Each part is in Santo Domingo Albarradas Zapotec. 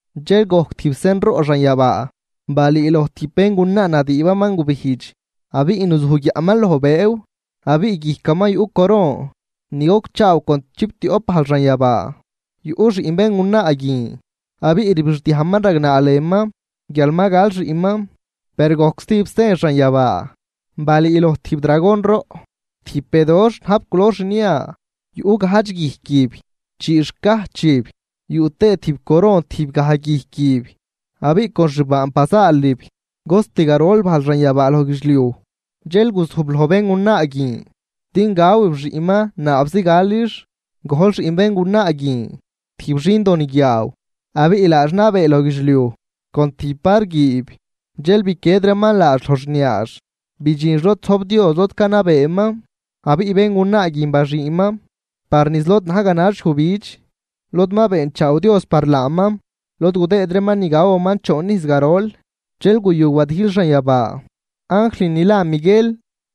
Dxel gojc tijb sen roꞌ xanyabaa. Balüüloj tijb béngunaa nadüübaman gubijdx, abiꞌ nuzuj guiaꞌman loj bëëw abiꞌ guijcaman yuꞌ coron ni gocchaaw con chiptioꞌp bajl xanyabaa. Yuꞌ xiꞌn béngunaa guin abiꞌ rbixdiajman ragnaa lënman guial ma gal xiꞌnman. Per gojc stijb sen xanyabaa. Balüüloj tijb dragon roꞌ, tijb bedoxh najb culor xnia. Yuꞌ gajdx guijquib, chii xcajchib yuꞌ tëë tijb coron tijb gaj guijquib. Abiꞌ con xbaanb bazaalib cost garol bajl xanyabaa loj guidxliuj. Dxel guzujb loj béngunaa guin din gawib xiꞌnman naabzi galix. Gojl xiꞌn béngunaa guin tijb xindo niguiaaw, abiꞌ laax nabee loj guidxliuj con tijb var guiib. Dxel biquied reeman laax loj xniaax, bidxinx lod zojb Dios lod canabeeman. Abiꞌ béngunaa guin baxüünman par niz lod na̱j ganax yujbidx, lod ma beenchaaw Dios par laaman, lod gudëëd reeman ni gawaman choon ijz garol. Dxel guyu wadijl xanyabaa, anjl ni la Miguel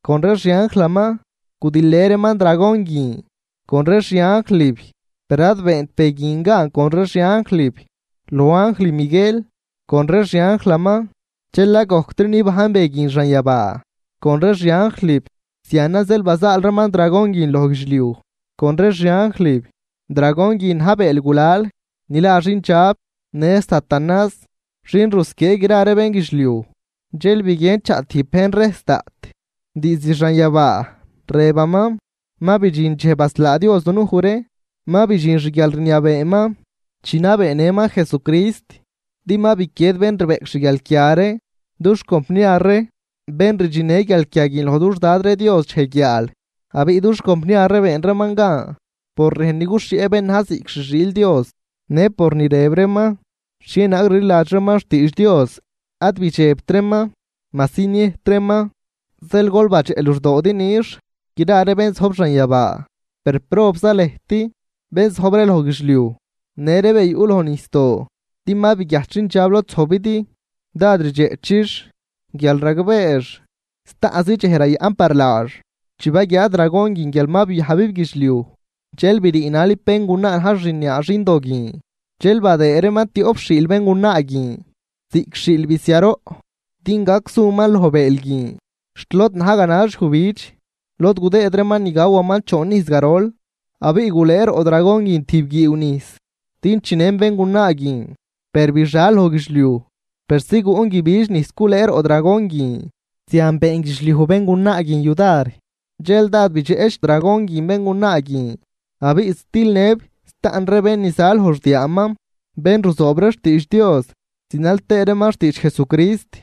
con ree xi anjlaman gudijlnë reeman dragon guin con ree xi anjlib. Per ad beent be guin gan con ree xi anjlib loj anjl Miguel con ree xi anjlaman, dxel ad gojctri nibajn be guin xanyabaa con ree xi anjlib. Zianan zeel bazaal reeman dragon guin loj guidxliuj con ree xi anjlib. Dragon guin na̱j bëël gulal ni la xindxab në satanás xin rusquiee gra ree bénguidxliuj. Dxel biguien chaꞌ tijb bejn rejs daꞌt diizd xanyabaa rëbaman: ―Ma bidxin dxej baslaa Dios dunuj ree, ma bidxin xguialrniabeeman chi nabeenëman Jesucrist, din ma biquied bén rbeꞌc xguialquia ree dux compniar ree, bén rdxinnë ree guialquia guin loj dux Dad ree Dios dxej guiaal. Abiꞌ dux compniar ree been reeman gan por rejn ni guxhieꞌ bén na̱j ziꞌc xi xiil Dios në por ni rëb reeman xhienaag rliladx reeman xtiidx Dios, ad bidxebt reeman majsi niëjt reeman. Zeel gol badxeꞌ luxdoodi nix gra ree bén zojb xanyabaa per, ¡probza lëjt bén zojb ree loj guidxliuj në ree be yuꞌ loj nijsdoo! Din ma biguiajt xindxab lod zojbidi, dád rdxeꞌchix guial ragbeex staꞌnz dxej rayaꞌn par laax. Chi baguiaa dragon guin guial ma biajbib guidxliuj, dxel briinalib béngunaa na̱j xniaa xindo guin. Dxel badëë reeman tioꞌp xiil béngunaa guin ziꞌc xiil bisiaroꞌ din gac suman loj bëël guin xt lod na̱j ganax yujbidx, lod gudëëd reeman ni gawaman choon ijz garol. Abiꞌ gulëë roꞌ dragon guin tijb guiiw nijs din chinën béngunaa guin. Per bixal loj guidxliuj persi guꞌn guibidx nijs gulëë roꞌ dragon guin. Zian been guidxliuj béngunaa guin yudar. Dxel dád bidxeꞌch dragon guin béngunaa guin, abiꞌ zitilnëb staꞌn ree bén ni za loj xdiaaman, bén ruzoob ree xtiidx Dios zinal tëë reeman xtiidx Jesucrist.